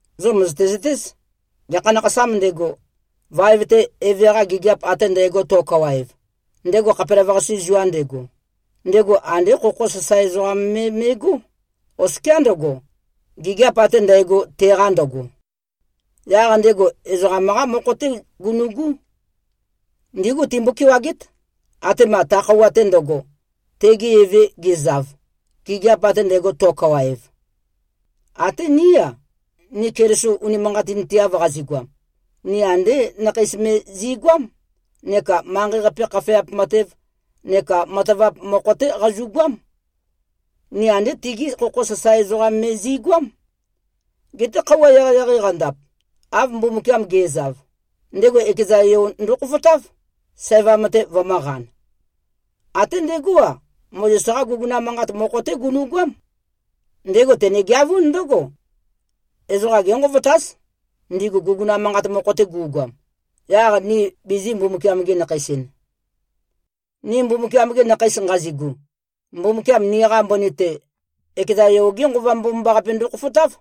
Zo mø̀zøte-zøtéz, gekha nakhasām ndego, vaev-te eve-qa gigiap ate ndægo to꞉kawaev, ndego khapelavøqase zua ndego, ndego andé khokho sasae ezoqam me me꞉gó, oskiá ndøgo, gigiap ate ndægo, teqa ndøgo. Yaq ndego ezoqam-qá mokho-té gunu꞉gú. Ndígu timbo-kewagét, atema ta khøuwa-te ndøgo, tege eve gezav, gigiap ate ndægo to꞉kawaev. Até ní-a, ni Keliso unimanqatinteav qazigoam, ni andé nakheis me zi꞉goám, neka manqei-qape khafeap matev neka matavap mokho-té qazu꞉goám. Ni andé tigí khokho sasae ezoqam me zi꞉goám. Geté, khøuwa eqeieqei qandap, av Mbumbukiam ge꞉zav, ndego ekeza Yo ndokhofotáv, sævam-te vømø̄qan. Até ndegó-a, Mozes-qá guguna manqat mokho-té gunu꞉goám. Ndego tenegeavún ndǿgo: Ezoqa génqovotáz, ndigu guguna manqat mokho-te gu꞉goam, yaq ni bizī꞉-Mbumbukiam-gi-nakheis-en. Ni Mbumbukiam-gi nakheis nqazigu, Mbumbukiam niqa mbøni-te, ekeza Yo-ge Nqova Mbomambaqape ndokhofotáv.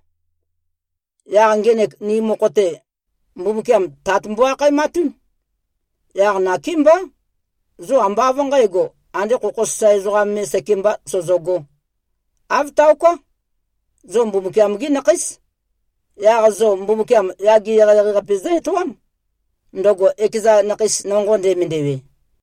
Yaq ngenek ni mokho-te, Mbumbukiam “Tat” mbo-akhaematún. Yaq nakémbá, zo ambá av nqǣgo, ande khokho sasae ezoqa me sekembā sozogō. Āv taoká. Zo Mbumbukiam-gí nakhéis. Yaq zo Mbumbukiam yage eqeieqei-qape zǿ-etoám, ndøgo ekeza nakheis nonqo ndemendewe.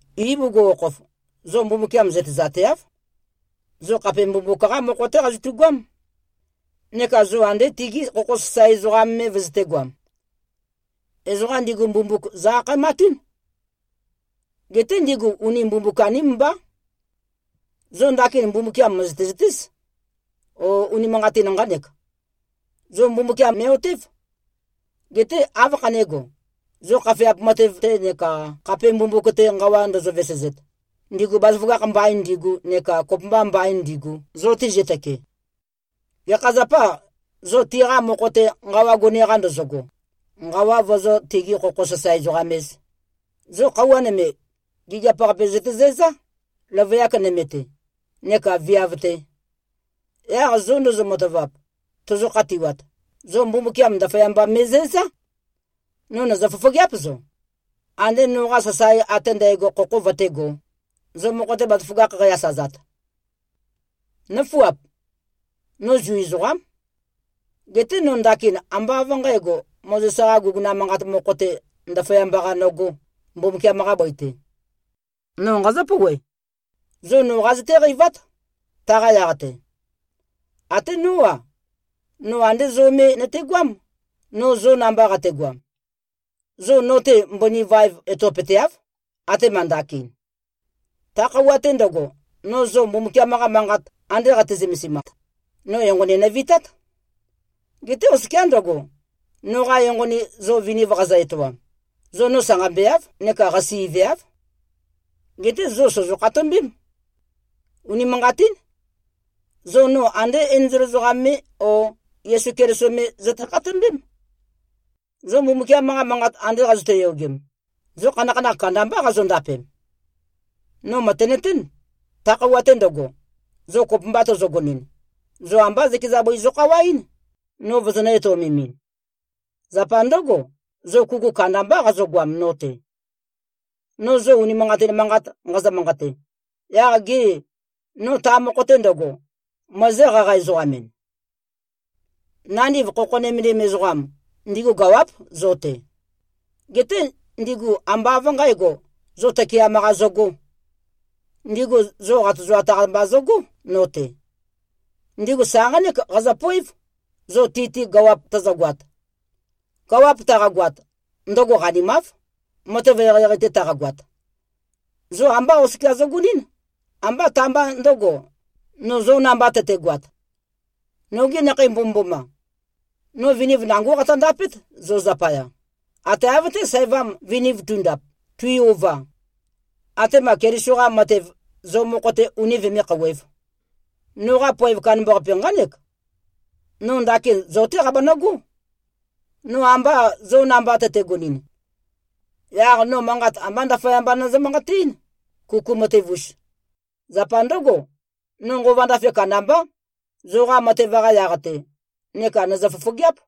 Ibugukhokhof, zo Mbumbukiam zøtezateáv. Zo khape mbumbuk-qá mokho-té qazotugoám, neka zo ande tigi khokho sasae ezoqam me vøzøtēgoam. Ezoqa ndigu mbumbuk zø-akhaematún. Geté ndigu uni mbumbuk-aním mbá. Zo ndakin Mbumbukiam mø̀zøte-zøtéz. O, unimanqatin nqánek. Zo Mbumbukiam me꞉-otév. Geté, áv khané꞉go, zo khafeap matev-te neka khape mbumbuk-te nqawa ndozo-vesezet, ndigu bazaføgakh mbain ndigu neka kopømba mbain ndigu, zo tizøtøke? Gekha zapâ, zo tiqa mokho-te nqawa gone-qa ndozogo, nqawa vozó-tigi-khokho-sasae-ezoqam-ēz? Zo khøuwa nøme, gigiap-qape zøtezæzá, løvøyak nøme-te neka viav-te. Yaq zo ndozo-matavap, tozo-khatiwat, zo Mbumbukiam ndaføyamba me꞉zæzá. No nø̀zø-fofogeáp zo. Andē noqa sasae ate ndægo khokho vøtégō, zo mokho-te bazaføgakh qæ-asazat. Nǿfuap! No Zu ezoqám. Geté no ndakin ambá av nqǣgo, Mozes-qa guguna manqat mokho-te, ndaføyamba-qa nøgō, Mbumbukiam-qa bøi-te. No nqazǿ-pouwe. Zo noqa zøtéqeivát, taqa yaq-te. Até nó-a, no andé zo me nøtegoám, no zo namba qategoam. Zo no-te mbøni vaev etopøteáv, atema ndakin. Ta khøuwa-te ndøgo, no zo Mbumbukiam-qa Manqat ande qate-zømesimat, no enqoni nøvitát. Geté oskiá ndøgo, noqa enqoni zo viniv qazø-etoam, zo no sanqambeáv neka qasi꞉veáv. Geté zo sòzo-khatombém. Unimanqatín. Zo no andé enzol ezoqam me o Yesu Keliso me zøte-khatombém. Zo Mbumbukiam-qa Manqat ande qazøte-yogem, zo khanakhanakh kandambá qazondapem. No mø̀tenøtén. Ta khøuwa-te ndøgo, zo kopømba tozogonɨn, zo ambá zøkeza bøi zokhawaɨ́n, no vozonø̄-etøomemɨn. Zapa ndǿgo, zo kuku kandambá qazogoam no-te. No zo unimanqatin manqat nqazø-manqate, yaq gê, no ta mokho-te ndøgo, møezǿ-qaqa-ezoqam-en? Nandiv khokho nømendim ezoqam, ndigu gawáp zo-te. Geté ndigu ambá av nqǣgo, zo tøkeam-qa zøgō. Ndigu zo qatozoat-qa mba zøgó, no-te. Ndigu sa nqánek qazøpoév, zo ti-te gawap tøzøgoat. Gawap taqagoat, ndøgo qanimáv, matev eqeieqei-te taqagoat. Zo ambá oskia zøgonɨ́n, ambá ta-mba ndø̄go, no zo namba tøtegoat. Nogi nakhei mbomømboma! No viniv nangó qatøndapét zo zapaya, ate av-té, sævam viniv tundap, tui-ova, atema Keliso-qa matev zo mokho-te uni vømé-khouwēv. Noqa poev kandambaqape nqánek: No ndakin zo-té qabanøgó. No amba zo namba tøtegonɨn, yaq no manqat ambá ndaføyamba nøzø-manqateɨ́n, kuku matev-us. Zapa ndǿgo, no nqova ndafe kandambá, zoqa matev-qa yaq-te, neka nø̀zø-fofogeáp.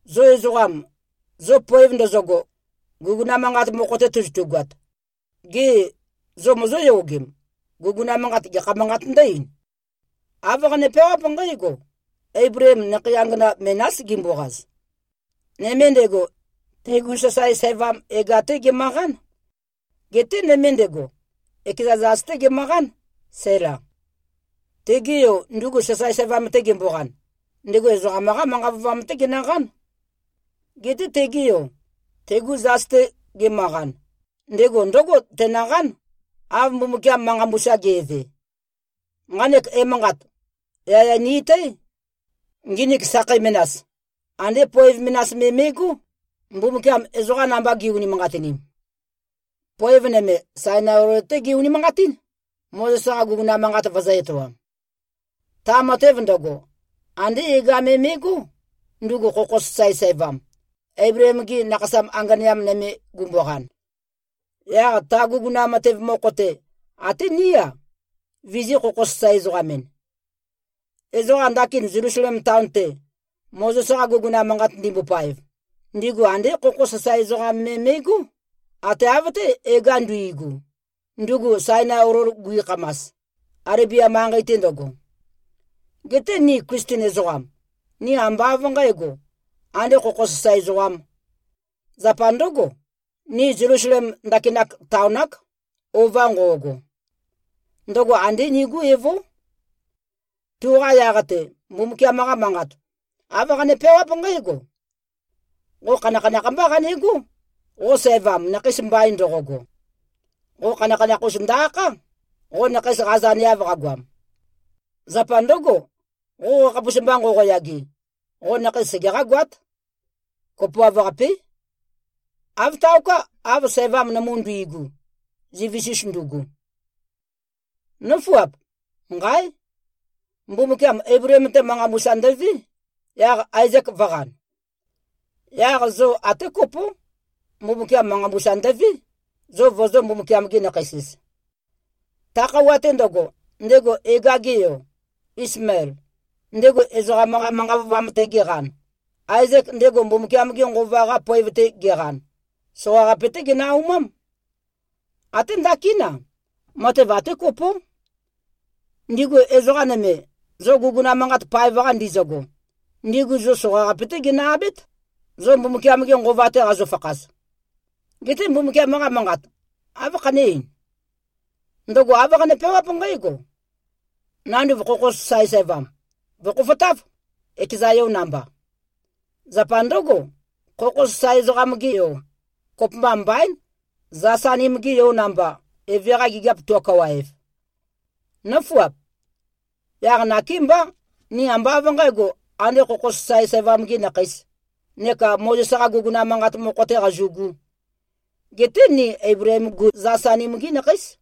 Zo ezoqam, zo poev ndøzøgo, guguna manqat mokho-te tozotugoat, gê, zo mozóyogem, guguna manqat, gekha manqāt ndǿ-ein? Āv qane-peawáp nqǽgo: Eibleem nakhei angana menás gimboqaz. Nøme ndego, tegu sasae sævam Hega-té gemøqán. Geté nøme ndego, ekeza zas-té gemøqán, Sæla. Tege yo, ndugu sasae sævam-te gemboqan, ndego ezoqam-qá manqa vøovam-té genøqán. Geté, tege yo, tegu zas-te gemøqan, ndego ndǿgo tenøqán, av Mbumbukiam manqa mbusa ge꞉ve. Nqanek emanqat, yaya ni-etǽ. Nginik sakhei menas, andé poev menas me me꞉gó, Mbumbukiam ezoqa namba gi꞉-unimanqatinim. Poev nøme, Sainai olol-té ge-unimanqatín, Mozes-qa guguna manqat vøzø̄-etoam. Ta matev ndøgo, andé Hega me me꞉gó, ndugu khokho sasae sævam, Eibleem-ge nakhasa anganeam nøme gumboqan. Yaq ta guguna matev mokho-te, até ní-a, vizī-khokho-sasae-ezoqam-en. Ezoqa ndakin Zelusalem taon-te, Mozes-qa guguna manqat ndimbopaev, ndigu andé khokho sasae ezoqam me me꞉gó, ate av-té, Hega nduigu, ndugu Sainai olol guikhamas, Alebia manqei-te ndøgo. Geté ni Klisten ezoqam, ni ambá av nqǣgo, ande khokho sasae ezoqām. Zapa ndǿgo, ni Zelusalem ndakinak taon-ák, ova nqo꞉go. Ndøgo andé nigú evó. Tuqa yaq-te, Mbumbukiam-qa Manqat, āv qane-peawáp nqǽgo, “Qo khanakhanakh mbá qanegó, qo sævam, nakheis mbain ndoqogo. Qo khanakhanakh-us ndø-akhá, qo nakheis qazøneav qagoam. Zapa ndǿgo, qo qakhapus mba nqoqoyage, qo nakheis segeqá-goát. Kopoav-qapé. Āv taoká, av sævam nømu nduigu, zivis-us ndugu.” Nǿfuap! Nqáe! Mbumbukiam Eibleem-te manqa mbusa ndøvé, yaq Aezek vø̄qan. Yaq zo até kopó. Mbumbukiam manqa mbusa ndøvé, zo vozō-Mbumbukiam-gi-nakheis-ez. Ta khøuwa-te ndøgo, ndego Hega-ge yo, Ismael, ndego ezoqam-qa manqa vøovam-te geqan, Aezek, ndego Mbumbukiam-ge Nqova-qa poev-te geqan, soqaqape-té genø-aumám. Até ndakín-a, matev até kopó. Ndigu ezoqa nøme, zo guguna manqat paev-qa ndizøgo, ndigu zo soqaqape-té ginø-abét, zo Mbumbukiam-ge Nqova-te qazofakhaz. Geté Mbumbukiam-qa Manqat, áv khané-ein? Ndøgo āv qane-peawáp nqǽgo, “Nanduv khokho sasae sævam, vø̀khofotáv, ekeza yo namba.” Zapa ndǿgo, khokho sasae ezoqam-ge yo, kopømba mbaín, zas-anim-ge yo namba, eve-qa gigiap to꞉kawaev. Nǿfuap! Yaq nakémbá, ni ambá av nqǣgo, andē khokho sasae sævam-gī nakheīs, neka Mozes-qa guguna manqat mokho-tē qazu꞉gū. Geté ni Eibleem-gu zas-anim-gí nakheís.